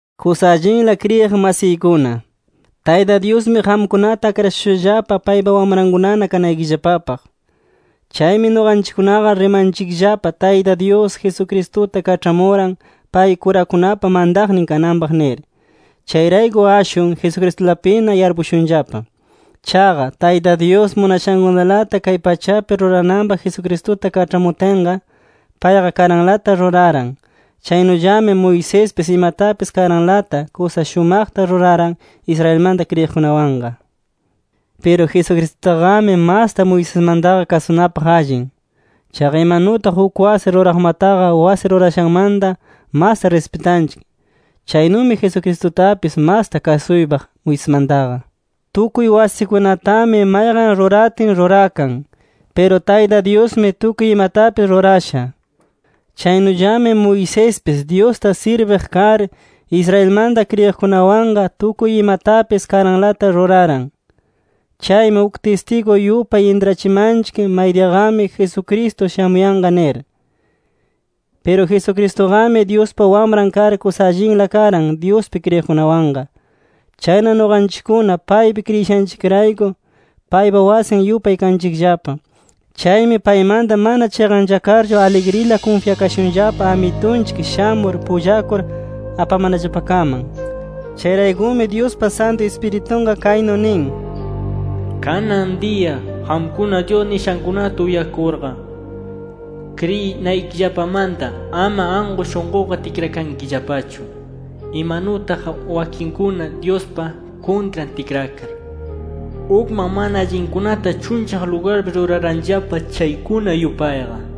Kusa allinla kriyiq masiykuna, Tayta Dyusmi qamkunata akrashushallapa paypa wamrankuna kanaykillapapaq. Chaymi nuqanchikkunaqa rimanchikllapa Tayta Dyus, Jesucristuta kaĉhamuran pay kurakunapa mantaqnin kananpaq nir. Chayrayku ashwan Jesucristulapina yarpukushunllapa. Chaqa Tayta Dyus munashankunalata kay pachapi rurananpaq Jesucristuta kaĉhamutinqa, payqa karanlata ruraran. Chaynullami Moisespis imatapis karanlata kusa shumaqta ruraran Israelmanta kriyiqkunawanqa. Piru Jesucristutaqami masta Moisesmantaqa kasunapaq allin. Chaqa imanutaq uk wasi ruraqmataqa wasi rurashanmanta masta rispitanchik, chaynumi Jesucristutapis masta kasuypaq Moisesmantaqa. Tukuy wasikunatami mayqan ruratin rurakan. Piru Tayta Dyusmi tukuy imatapis rurasha. Chaynullami Moisespis Dyusta sirbiq kar, Israelmanta kriyiqkunawanqa tukuy imatapis karanlata ruraran. Chaymi uk tistigu yupay intrachimanchik maydiyaqami Jesucristo shamuyanqa nir. Piru Jesucristuqami Dyuspa Wamran kar, kusa allinla karan Dyuspi kriyiqkunawanqa. Chayna nuqanchikkuna paypi kriyishanchikrayku, paypa wasin yupay kanchikllapa. Chaymi paymanta mana chiqanchakarchu aligrila kunfyakashunllapa Amitunchik shamur pullakur apamanallapakaman. Chayraykumi Dyuspa Santu Ispiritunqa kaynu nin: “Kanan diya qamkuna, Dyus nishankunata uyakurqa, kriyinaykillapamanta ama anku shunquqa tikrakankillapachu, imanutaq wakinkuna Dyuspa kuntran tikrakar, ukman mana allinkunata chunllaq lugarpi ruraranllapa chaykuna yupayqa.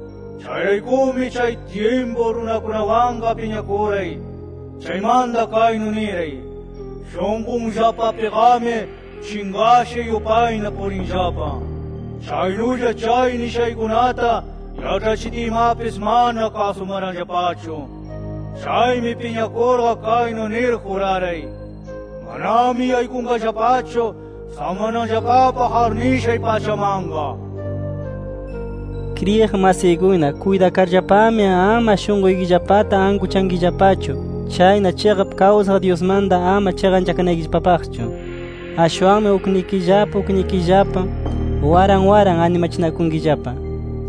Chayraykumi chay tyimpu runakunawanqa piñakuray. Chaymanta kaynu niray: ‘Shunqunllapapiqami chinqasha yupayna purinllapa. Chaynulla chay nishaykunata yaĉhachitiymapis, mana kasumaranllapachu’. Chaymi, piñakurqa kaynu nir juraray: ‘Manami yaykunqallapachu samananllapapaq arnishay pachamanqa’ nir”. Kriyiq masiykuna, kuytakarllapami, ama shunquykillapata ankuchankillapachu. Chayna chiqap kawsaq Dyusmantaqa ama chiqanchakanaykillapapaqchu. Ashwanmi uknikillapa uknikillapa waran waran animachinakunkillapa.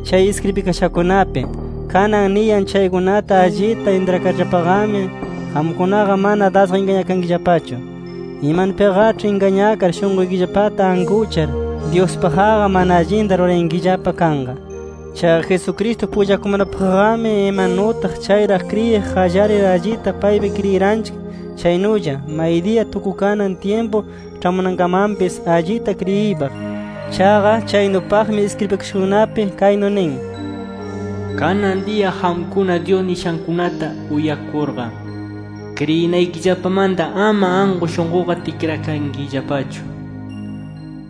Chay iskribikashakunapi kanan niyan chaykunata allita intrakarllapaqami, qamkunaqa mana dasqa ingañakankillapachu. Imanupiqaĉhi ingañakar shunquykillapata ankuchar, Dyuspaqqa mana allinta rurayankillapa kanqa. Chaqa Jesucristo pullakumanapaqqami, imanutaq chayraq kriyiq qallarir allita paypi kriyiranchik chaynulla, maydiya tukukanan tyimpu ĉhamunankamanpis allita kriyiypaq. Chaqa chaynupaqmi iskribikashakunapi kaynu nin: “Kanan diya qamkuna, Dyus nishankunata uyakurqa, kriyinaykillapamanta ama anku shunquqa tikrakankillapachu,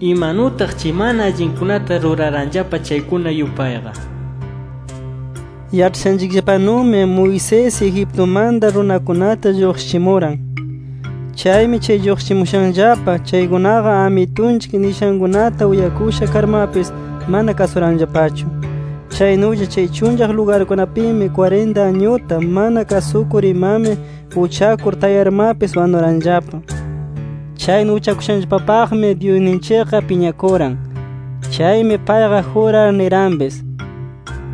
imanutaq chay mana allinkunata ruraranllapa chaykuna yupayqa” nir. Yaĉhashanchikllapanumi, Moisés Egiptumanta runakunata lluqshichimuran. Chaymi chay lluqshichimushanllapa chaykunaqa, Amitunchik nishankunata uyakusha karmapis mana kasuranllapachu. Chaynulla chay chunllaq lugarkunapimi, kwarinta añuta mana kasukur imami uchakur tayarmapis wanuranllapa. Chaynu uchakushanllapapaqmi Dyusninchikqa piñakuran. Chaymi payqa jurar niranpis,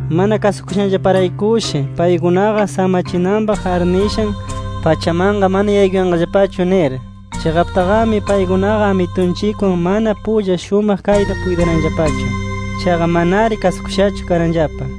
mana kasukushanllaparaykushi paykunaqa, samachinanpaq arnishan pachamanqa mana yaykuyanqallapachu nir. Chiqaptaqami paykunaqa, Amitunchikwan mana pulla shumaq kaytaqa puytiranllapachu. Chaqa manari kasukushachu karanllapa.